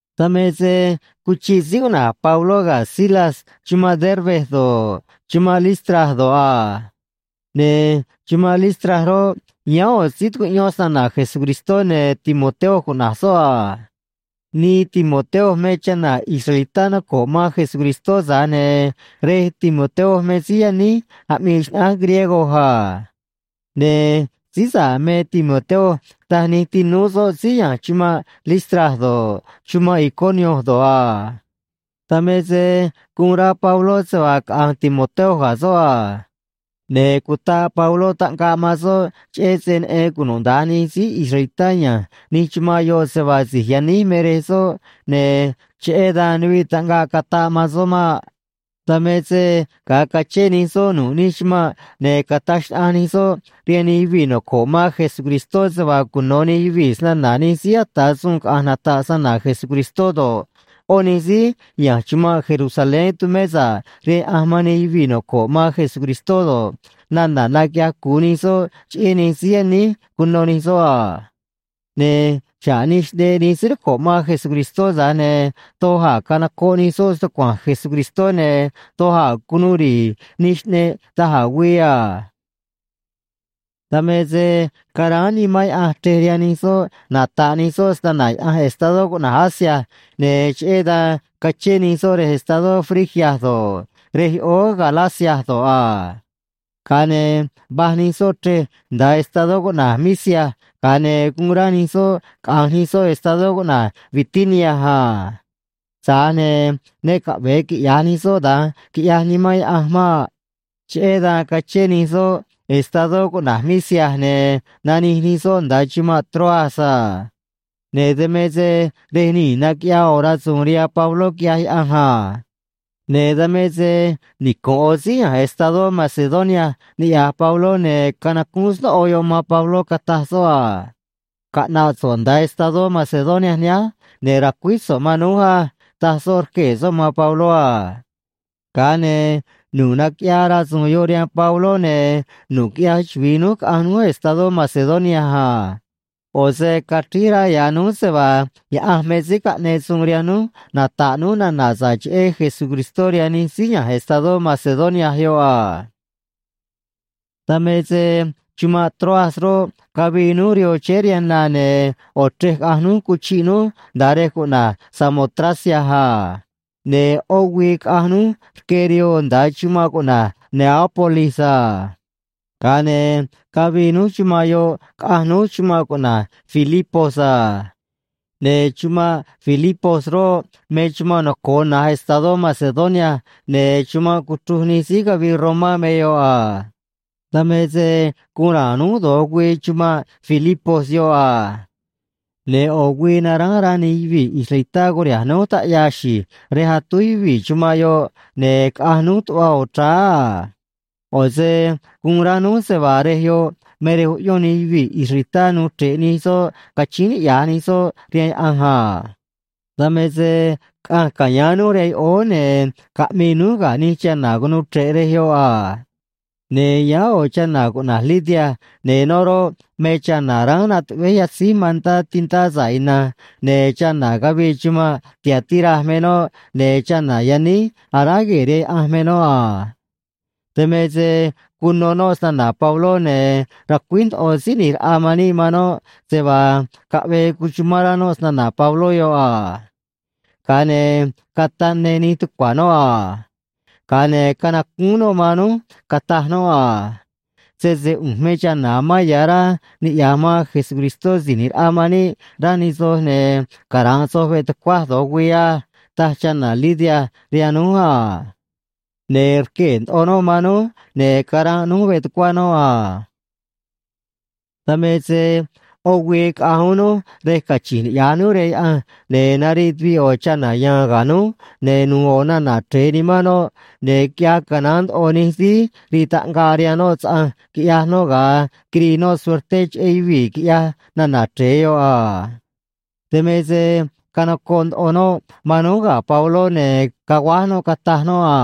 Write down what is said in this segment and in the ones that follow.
Dan me se cuchiꞌ síí cuꞌna̱j Pabló ga̱ Silas chumanꞌ Derbe do̱ꞌ, chumanꞌ Listra do̱ꞌ a. Ne̱ chumanꞌ Listra roꞌ, yáán ꞌo̱ síí tucuꞌyón snana̱ Jesucristó, ne̱ Timoteo cuꞌna̱j soꞌ a. Nii Timoteo me chana̱ israelitá noco̱ꞌ man Jesucristó, tza̱j ne̱ rej Timoteo me síí yaníj aꞌmii xnaꞌánj griego a. Ne̱ síí sa̱ꞌ me Timoteo, taj nij tinúú soꞌ síí ya̱nj chumanꞌ Listra do̱ꞌ, chumanꞌ Iconio do̱ꞌ a. Dan me se guun rá Pabló se vaa caꞌa̱nj Timoteo ga̱ soꞌ a. Ne̱ cutaꞌ Pabló taꞌngaꞌ man soꞌ, cheꞌé se neꞌen cunuda̱nj nij síí israelitá ya̱nj nij chumanꞌ yoꞌ se vaa si̱j yaníj me rej soꞌ ne̱ cheꞌé dan nuviꞌ taꞌngaꞌ cataꞌ man soꞌ maꞌ. Dan me se ga̱a cachén nij soꞌ nu̱ꞌ nij chumanꞌ, ne̱ cataj xnaꞌanj nij soꞌ rihaan nij yuvii̱ noco̱ꞌ man Jesucristó se vaa cuno̱ nij yuvii̱ snana̱ nij síí ata̱ suun caꞌa̱nj nata̱ꞌ snana̱ Jesucristó do̱ꞌ, ꞌó nij síí ya̱nj chumanꞌ Jerusalén tumé sa̱ꞌ rihaan Yaꞌanj man nij yuvii̱ noco̱ꞌ man Jesucristó do̱ꞌ, nana̱ naquiꞌyaj cu̱u nij soꞌ cheꞌé nij síí yaníj cuno̱ nij soꞌ a. Ne̱ xa̱ꞌ nij xꞌneꞌ nij síí noco̱ꞌ man Jesucristó, tza̱j ne̱ doj a̱ canocoꞌ nij soꞌ stucua̱nj Jesucristó, ne̱ doj a̱ cunuu ri̱i̱ nij xꞌneꞌ da̱j a̱ güii a. Dan me se caráán Nimán Yaꞌanj chrej rihaan nij soꞌ nata̱ꞌ nij soꞌ snana̱ Yaꞌanj estadó cuꞌna̱j Asia, ne̱ cheꞌé dan cachén nij soꞌ rej estadó Frigia do̱ꞌ, rej yoꞌóó Galacia do̱ꞌ a. Ga̱a ne̱ va̱j nij soꞌ chrej nda̱a estadó cuꞌna̱j Misia, ga̱a ne̱ guun rá nij soꞌ caꞌa̱nj nij soꞌ estadó cuꞌna̱j Bitinia a. Tza̱j ne̱ ne caꞌve̱e quiꞌya̱j nij soꞌ da̱nj, quiꞌyaj Nimán Yaꞌanj maꞌ. Cheꞌé dan cachén nij soꞌ estadó cuꞌna̱j Misia, ne̱ nanij nij soꞌ nda̱a chumanꞌ Troas a. Ne̱ dan me se rej nii̱ naquiꞌyaa ꞌo̱ rasu̱u̱n rihaan Pabló, quiꞌyaj Yaꞌanj a. Ne̱ dan me se nicu̱nꞌ ꞌo̱ síí ya̱nj estadó Macedonia niꞌya̱j Pabló, ne̱ canacúún snóꞌo yoꞌ man Pabló, cataj soꞌ a: “Caꞌna̱ꞌ so̱ꞌ nda̱a estadó Macedonia nihánj, ne̱ ra̱cuíj so̱ꞌ man núj á”, taj soꞌ rquee̱ soꞌ man Pabló a. Ga̱a ne̱ nu̱ꞌ naquiꞌyaa rasu̱u̱n yoꞌ rihaan Pabló, ne̱ nu̱ꞌ quiꞌyaj chuvi̱i núj caꞌa̱nj núj estadó Macedonia a. ꞌO̱ se cachríj rá ya̱ núj se vaa Yaꞌanj me síí caꞌneꞌ suun rihaan núj nata̱ꞌ núj nana̱ sa̱ꞌ cheꞌé Jesucristó rihaan nij síí ya̱nj estadó Macedonia yoꞌ a. Dan me se chumanꞌ Troas roꞌ, cavii núj rihoo chéé rihaan na, ne̱ ꞌo̱ chrej caꞌanj núj cuchiꞌ núj nda̱a rej cuꞌna̱j Samotracia a. Ne̱ ꞌó güii caꞌanj núj rque rihoo nda̱a chumanꞌ cuꞌna̱j Neápolis a. Ga̱a ne̱ cavii núj chumanꞌ yoꞌ, caꞌanj núj chumanꞌ cuꞌna̱j Filipos a. Ne̱ chumanꞌ Filipos roꞌ, me chumanꞌ noco̱o na̱j estadó Macedonia, ne̱ chumanꞌ cuchruj nij síí cavii Romá me yoꞌ a. Dan me se guun ra̱a̱n núj do̱j güii chumanꞌ Filipos yoꞌ a. Ne̱ ꞌo̱ güii naránj rá nij yuvii̱ israelitá curiha̱nj núj taꞌyaa xi̱j rej atúj yuvii̱ chumanꞌ yoꞌ, ne̱ caꞌanj núj tuꞌva ꞌo̱ chráá a. ꞌO̱ se guun rá núj se vaa rej yoꞌ me rej uꞌyón nij yuvii̱ israelitá nuu chre̱ꞌ nij soꞌ cachíín niꞌya̱j nij soꞌ rihaan Yaꞌanj a. Dan me se caꞌanj ca̱yáán núj rihaan yoꞌóó, ne̱ caꞌmii núj ga̱ nij chana̱ cunuu chre̱ꞌ rej yoꞌ a. Ne̱ yáán ꞌo̱ chana̱ cuꞌna̱j Lidia, ne̱ noꞌ roꞌ, me chana̱ ránj natuꞌvéj yatzíj mantá tintá sa̱ꞌ ina̱nj, ne̱ chana̱ cavii chumanꞌ Tiatira me noꞌ, ne̱ chana̱ yaníj aráj gue̱e̱ rihaan Yaꞌanj me noꞌ a. Dan me se cuno noꞌ snana̱ Pabló, ne̱ racuíj ndoꞌo Síí ꞌNi̱j Raꞌa man níꞌ man noꞌ se vaa caꞌvee cuchumán rá noꞌ snana̱ Pabló yoꞌ a. Ga̱a ne̱ cataꞌ ne nij tucua̱ noꞌ a. Ga̱a ne̱ canacúún noꞌ man núj, cataj noꞌ a: ―Sese ꞌu̱nj me chana̱ amán ya̱ rá niꞌya̱j man Jesucristó Si̱j ꞌNi̱j Raꞌa man níꞌ, rá nij soj, ne̱ cara̱nꞌ soj veꞌ tucuaj do̱j güii á ―taj chana̱ Lidia rihaan núj a. Ne̱ rquee̱ ndoꞌo noꞌ man núj, ne̱ caranꞌ núj veꞌ tucuá noꞌ a. Dan me se ꞌó güii caꞌanj uún núj rej cachi̱nj niꞌya̱j núj rihaan Yaꞌanj, ne̱ nariꞌ tuviꞌ ꞌo̱ chana̱ ya̱a̱n ga̱ núj, ne̱ nu̱u̱ ꞌo̱ nana̱ chre̱e nimán noꞌ, ne̱ quiꞌyaj canaán ndoꞌo nij síí rii taꞌngaꞌ rihaan noꞌ saꞌanj, quiꞌyaj noꞌ ga̱a quirii noꞌ suerté cheꞌé yuvii̱ quiꞌyaj nana̱ chre̱e yoꞌ a. Dan me se canocoꞌ ndoꞌo noꞌ man núj ga̱ Pabló, ne̱ caguáj noꞌ, cataj noꞌ a: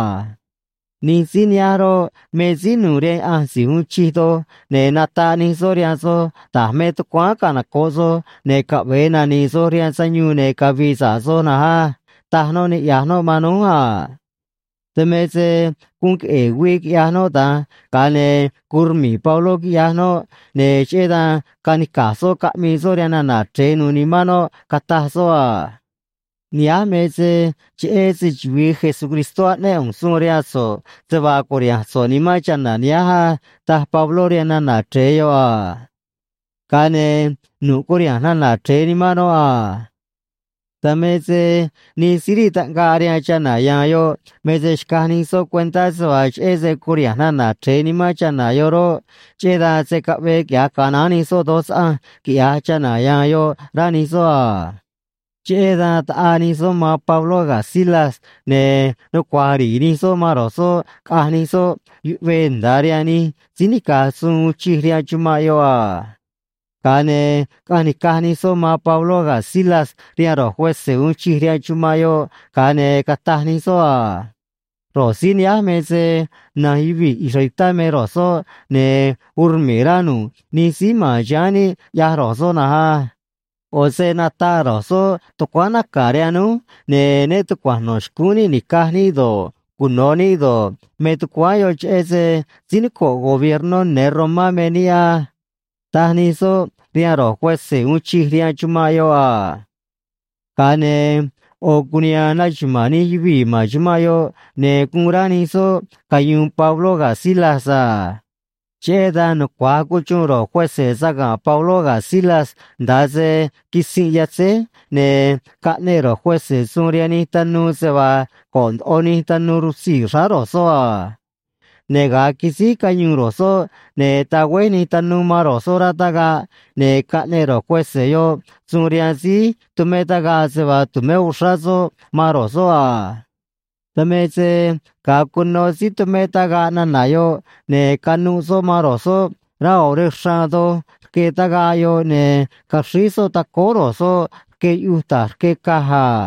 ―Nij síí nihánj roꞌ, me síí nu̱u̱ rihaan Yaꞌanj Si̱j Uun Chij Doj, ne̱ nataꞌ nij soꞌ rihaan soj da̱j me tucuáán canoco̱ꞌ soj ne̱ caꞌve̱e nani̱i̱ soj rihaan sayuun ne̱ cavi̱i̱ sa̱ꞌ soj na̱nj á ―taj noꞌ, niꞌya̱j noꞌ man núj a. Dan me se guun queꞌe̱e̱ güii quiꞌyaj noꞌ da̱nj, ga̱a ne̱ guun rmi̱i̱ Pabló, quiꞌyaj noꞌ, ne̱ cheꞌé dan canica̱j soꞌ caꞌmii soꞌ rihaan nana̱ chre̱e nu̱u̱ nimán noꞌ, cataj soꞌ a: ―Nihánj me se cheꞌé se‑chuvi̱i Jesucristó aꞌnéꞌ ꞌu̱nj suun rihaan so̱ꞌ se vaa cu̱riha̱nj so̱ꞌ nimán chana̱ nihánj á ―taj Pabló rihaan nana̱ chre̱e yoꞌ a. Ga̱a ne̱ nu̱ꞌ curiha̱nj nana̱ chre̱e nimán noꞌ a. Dan me se nij síí rii taꞌngaꞌ rihaan chana̱ ya̱a̱n yoꞌ me se xcaj nij soꞌ cuentá se vaa cheꞌé se curiha̱nj nana̱ chre̱e nimán chana̱ yoꞌ roꞌ, cheꞌé dan se̱ caꞌvee quiꞌya̱j canaán nij soꞌ doj saꞌanj quiꞌya̱j chana̱ ya̱a̱n yoꞌ, rá nij soꞌ a. Cheꞌé dan taꞌaa nij soꞌ man Pabló ga̱ Silas, ne̱ nucua̱j ri̱i̱ nij soꞌ man ro̱j soꞌ caꞌanj nij soꞌ yuꞌvee nda̱a rihaan nij síí nica̱j suun uun chij rihaan chumanꞌ yoꞌ a. Ga̱a ne̱ caꞌanj nica̱j nij soꞌ man Pabló ga̱ Silas rihaan ro̱j cuese̱ uun chij rihaan chumanꞌ yoꞌ, ga̱a ne̱ cataj nij soꞌ a: ―Ro̱j síí nihánj me se na̱nj yuvii̱ israelitá me ro̱j soꞌ, ne̱ uun rmi̱i̱ rá nu̱ꞌ nij síí ma̱n chiháán níꞌ ꞌyaj ro̱j soꞌ na̱nj á. ꞌO̱ se nataꞌ ro̱j soꞌ tucuáán naca̱ rihaan núj, ne̱ né tucua̱nj no̱ xcúún níꞌ ni̱caj níꞌ do̱ꞌ, cuno̱ níꞌ do̱ꞌ, me tucuáán yoꞌ cheꞌé se síí noco̱ꞌ gobiernó ne̱ Romá me níꞌ á ―taj nij soꞌ rihaan ro̱j cuese̱ uun chij rihaan chumanꞌ yoꞌ a. Ga̱a ne̱ ꞌo̱ cuniha̱a̱n naxuma̱a̱n nij yuvii̱ ma̱n chumanꞌ yoꞌ, ne̱ guun rá nij soꞌ cayu̱u̱n Pabló ga̱ Silas a. Cheꞌé dan nucua̱j cuxuun ro̱j cuese̱ saga̱nꞌ Pabló ga̱ Silas nda̱a se quitzinꞌ yatzéj, ne̱ caꞌneꞌ ro̱j cuese̱ suun rihaan nij tanuu se vaa go̱ꞌ ndoꞌo nij tanuu rutzii̱ xráá ro̱j soꞌ a. Ne̱ ga̱a quisíj cayuun ro̱j soꞌ, ne̱ tagüéj nij tanuu man ro̱j soꞌ rá tagaꞌ, ne̱ caꞌneꞌ ro̱j cuese̱ yoꞌ suun rihaan síí tumé tagaꞌ se vaa tu̱mé uxrá soꞌ man ro̱j soꞌ a. Dan me se ga̱a cuno síí tumé tagaꞌ nana̱ yoꞌ, ne̱ canuꞌ soꞌ man ro̱j soꞌ rá ꞌo̱ rej xraan doj rque tagaꞌ yoꞌ, ne̱ caxríj soꞌ tacóó ro̱j soꞌ rque yuꞌuj ta̱j rque caj a.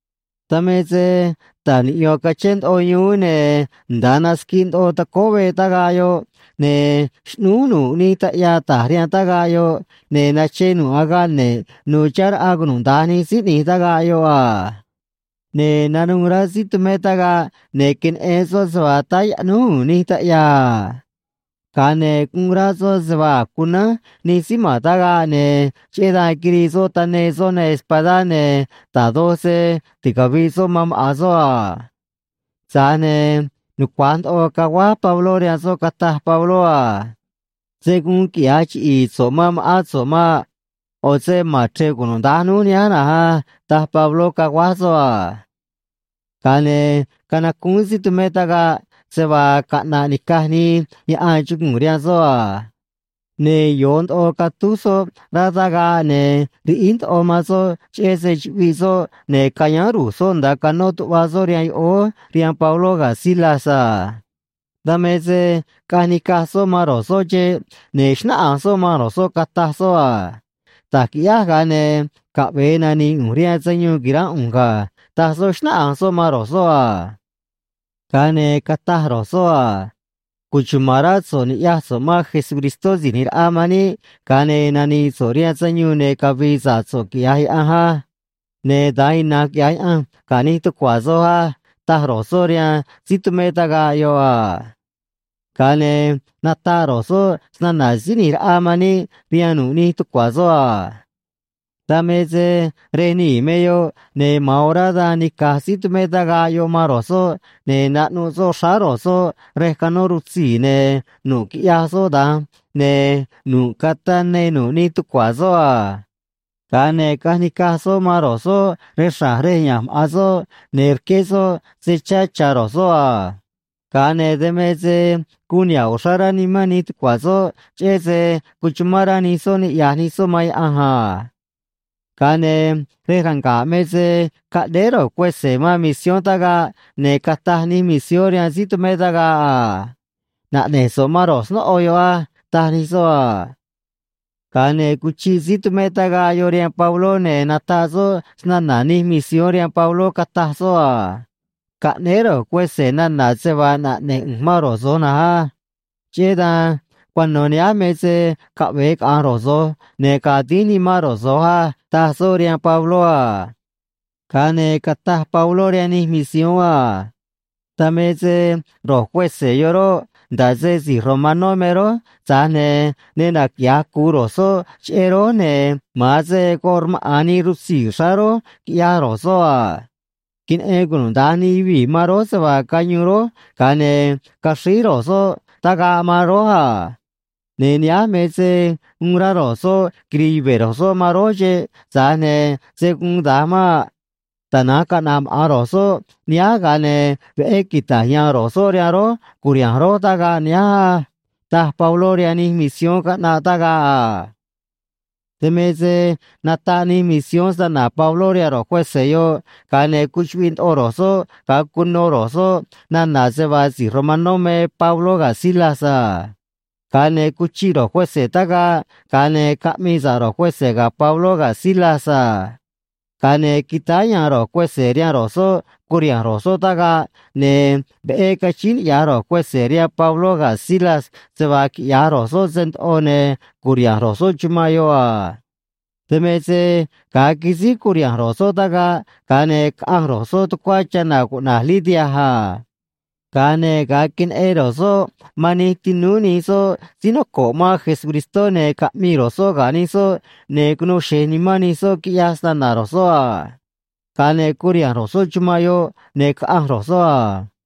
Dan me se taj niꞌyo̱n cachén ndoꞌo yuún, ne̱ nda̱a nasquiꞌ ndoꞌo tacóó veꞌ tagaꞌ yoꞌ, ne̱ xꞌnúj nu̱ꞌ nij taꞌyaa ta̱j rihaan tagaꞌ yoꞌ, ne̱ nache nu̱ꞌ agaꞌ ne̱ꞌ nu̱u̱ chihá raꞌa cunuda̱nj nij síí ꞌni̱j tagaꞌ yoꞌ a. Ne̱ nanuû rá síí tumé tagaꞌ, ne̱ queneꞌen soꞌ se vaa táá yaꞌnúj u̱u̱n nij taꞌyaa a. Ga̱a ne̱ guun rá soꞌ se vaa a̱j cunánj nij síí ma̱n tagaꞌ, ne̱ cheꞌé dan quirii soꞌ taneê soꞌ neê espadá, ne̱ da̱j doj se ticavi̱ꞌ soꞌ man maꞌa̱n soꞌ a. Tza̱j ne̱ nucua̱j ndoꞌo caguáj Pabló rihaan soꞌ, cataj Pabló a: ―Se̱ guun quiꞌya̱j chiꞌi̱i̱ so̱ꞌ man ma̱ꞌán so̱ꞌ maꞌ. ꞌO̱ se ma̱n chre̱ꞌ cunuda̱nj núj nihánj na̱nj á ―taj Pabló, caguáj soꞌ a. Ga̱a ne̱ canacúún síí tumé tagaꞌ se vaa caꞌna̱ꞌ ni̱caj nii yaꞌan chugu̱u̱n rihaan soꞌ a. Ne̱ yo̱o ndoꞌo catúj soꞌ rá tagaꞌ, ne̱ riꞌíj ndoꞌo man soꞌ cheꞌé se chuꞌviꞌ soꞌ, ne̱ cayáán ru̱j soꞌ nda̱a canó tuꞌva soꞌ rihaan yoꞌóó rihaan Pabló ga̱ Silas a. Dan me se caꞌanj nica̱j soꞌ man ro̱j soꞌ xeꞌ, ne̱ xnáꞌanj soꞌ man ro̱j soꞌ, cataj soꞌ a: ―Da̱j qui̱ꞌyáj, ga̱a ne̱ caꞌve̱e nani̱i̱ ꞌu̱nj rihaan sayuun qui̱ránꞌ ꞌu̱nj ga̱ ―taj soꞌ, xnáꞌanj soꞌ man ro̱j soꞌ a. Ga̱a ne̱ cataj ro̱j soꞌ a: ―Cuchuma̱n rá so̱ꞌ ni̱ꞌyaj so̱ꞌ man Jesucristó Si̱j ꞌNi̱j Raꞌa man níꞌ, ga̱a ne̱ nani̱i̱ so̱ꞌ rihaan sayuun ne̱ cavi̱i̱ sa̱ꞌ so̱ꞌ, quiꞌya̱j Yaꞌanj á. Ne̱ da̱nj ina̱nj quiꞌya̱j Yaꞌanj ga̱ nij tucua̱ soj á ―taj ro̱j soꞌ rihaan síí tumé tagaꞌ yoꞌ a. Ga̱a ne̱ nataꞌ ro̱j soꞌ snana̱ Síí ꞌNi̱j Raꞌa man níꞌ rihaan nu̱ꞌ nij tucua̱ soꞌ a. Dan me se rej nii̱ me yoꞌ, ne̱ ma̱an orá dan nica̱j síí tumé tagaꞌ yoꞌ man ro̱j soꞌ, ne̱ naꞌnuꞌ soꞌ xráá ro̱j soꞌ rej canó rutzii̱, ne̱ nu̱ꞌ quiꞌyaj soꞌ da̱nj, ne̱ nu̱ꞌ cataꞌ ne nu̱ꞌ nij tucua̱ soꞌ a. Ga̱a ne̱ caꞌanj nica̱j soꞌ man ro̱j soꞌ rej xra̱j rej ya̱nj maꞌa̱n soꞌ, ne̱ rqué soꞌ se chá cha̱ ro̱j soꞌ a. Ga̱a ne̱ dan me se guun niha̱ꞌ uxrá rá nimán nij tucua̱ soꞌ, cheꞌé se cuchumán rá nij soꞌ niꞌya̱j nij soꞌ man Yaꞌanj a. Ga̱a ne̱ rej ranga̱ꞌ me se caꞌnéé ro̱j cuese̱ man misión tagaꞌ, ne̱ cataj nij misión rihaan síí tumé tagaꞌ a: ―Naꞌne̱j so̱ꞌ man ro̱j snóꞌo yoꞌ á ―taj nij soꞌ a. Ga̱a ne̱ cuchiꞌ síí tumé tagaꞌ yoꞌ rihaan Pabló, ne̱ nataꞌ soꞌ snana̱ nij misión rihaan Pabló, cataj soꞌ a: ―Caꞌnéé ro̱j cuese̱ nana̱ se vaa naꞌne̱j ꞌu̱nj man ro̱j so̱j na̱nj á. Cheꞌé dan cuano̱ nihánj me se caꞌve̱e caꞌa̱nj ro̱j so̱j, ne̱ ga̱a̱ dínj nimán ro̱j so̱j á ―taj soꞌ rihaan Pabló a. Ga̱a ne̱ cataj Pabló rihaan nij misión a: ―Dan me se ro̱j cuese̱ yoꞌ roꞌ, nda̱ꞌ se si̱j romanó me rój, tza̱j ne̱ ne naquiꞌya̱j cu̱u ro̱j soꞌ cheꞌé rój, ne̱ ma̱an se goꞌ rmaꞌa̱n nii rutzii̱ xráá rój, quiꞌyaj ro̱j soꞌ a. Queneꞌen cunuda̱nj nij yuvii̱ man rój se vaa cayuun rój, ga̱a ne̱ caxríj ro̱j soꞌ tagaꞌ man rój a. Ne̱ nihánj me se uun rá ro̱j soꞌ quiri̱i̱ yuve̱ ro̱j soꞌ man rój xeꞌ, tza̱j ne̱ se̱ guun da̱nj maꞌ. Tana̱nj caꞌna̱ꞌ maꞌa̱n ro̱j soꞌ nihánj, ga̱a ne̱ veꞌé quita̱j ya̱a̱n ro̱j soꞌ rihaan rój cu̱riha̱nj rój tagaꞌ nihánj á ―taj Pabló rihaan nij misión caꞌnaꞌ tagaꞌ a. Dan me se nataꞌ nij misión snana̱ Pabló rihaan ro̱j cuese̱ yoꞌ, ga̱a ne̱ cuchuꞌviꞌ ndoꞌo ro̱j soꞌ ga̱a cuno ro̱j soꞌ nana̱ se vaa si̱j romanó me Pabló ga̱ Silas a. Ga̱a ne̱ cuchiꞌ ro̱j cuese̱ tagaꞌ, ga̱a ne̱ caꞌmii sa̱ꞌ ro̱j cuese̱ ga̱ Pabló ga̱ Silas a. Ga̱a ne̱ quitáá ya̱a̱n ro̱j cuese̱ rihaan ro̱j soꞌ curiha̱nj ro̱j soꞌ tagaꞌ, ne̱ veꞌé cachíín niꞌya̱j ro̱j cuese̱ rihaan Pabló ga̱ Silas se vaa quiꞌya̱j ro̱j soꞌ se ndoꞌo, ne̱ cu̱riha̱nj ro̱j soꞌ chumanꞌ yoꞌ a. Dan me se ga̱a quisíj curiha̱nj ro̱j soꞌ tagaꞌ, ga̱a ne̱ caꞌanj ro̱j soꞌ tucuá chana̱ cuꞌna̱j Lidia a. Ga̱a ne̱ ga̱a queneꞌen ro̱j soꞌ man nij tinúú nij soꞌ síí noco̱ꞌ man Jesucristó, ne̱ caꞌmii ro̱j soꞌ ga̱ nij soꞌ, ne̱ cunuu xe̱j nimán nij soꞌ quiꞌyaj snana̱ ro̱j soꞌ a. Ga̱a ne̱ curiha̱nj ro̱j soꞌ chumanꞌ yoꞌ, ne̱ caꞌanj ro̱j soꞌ a.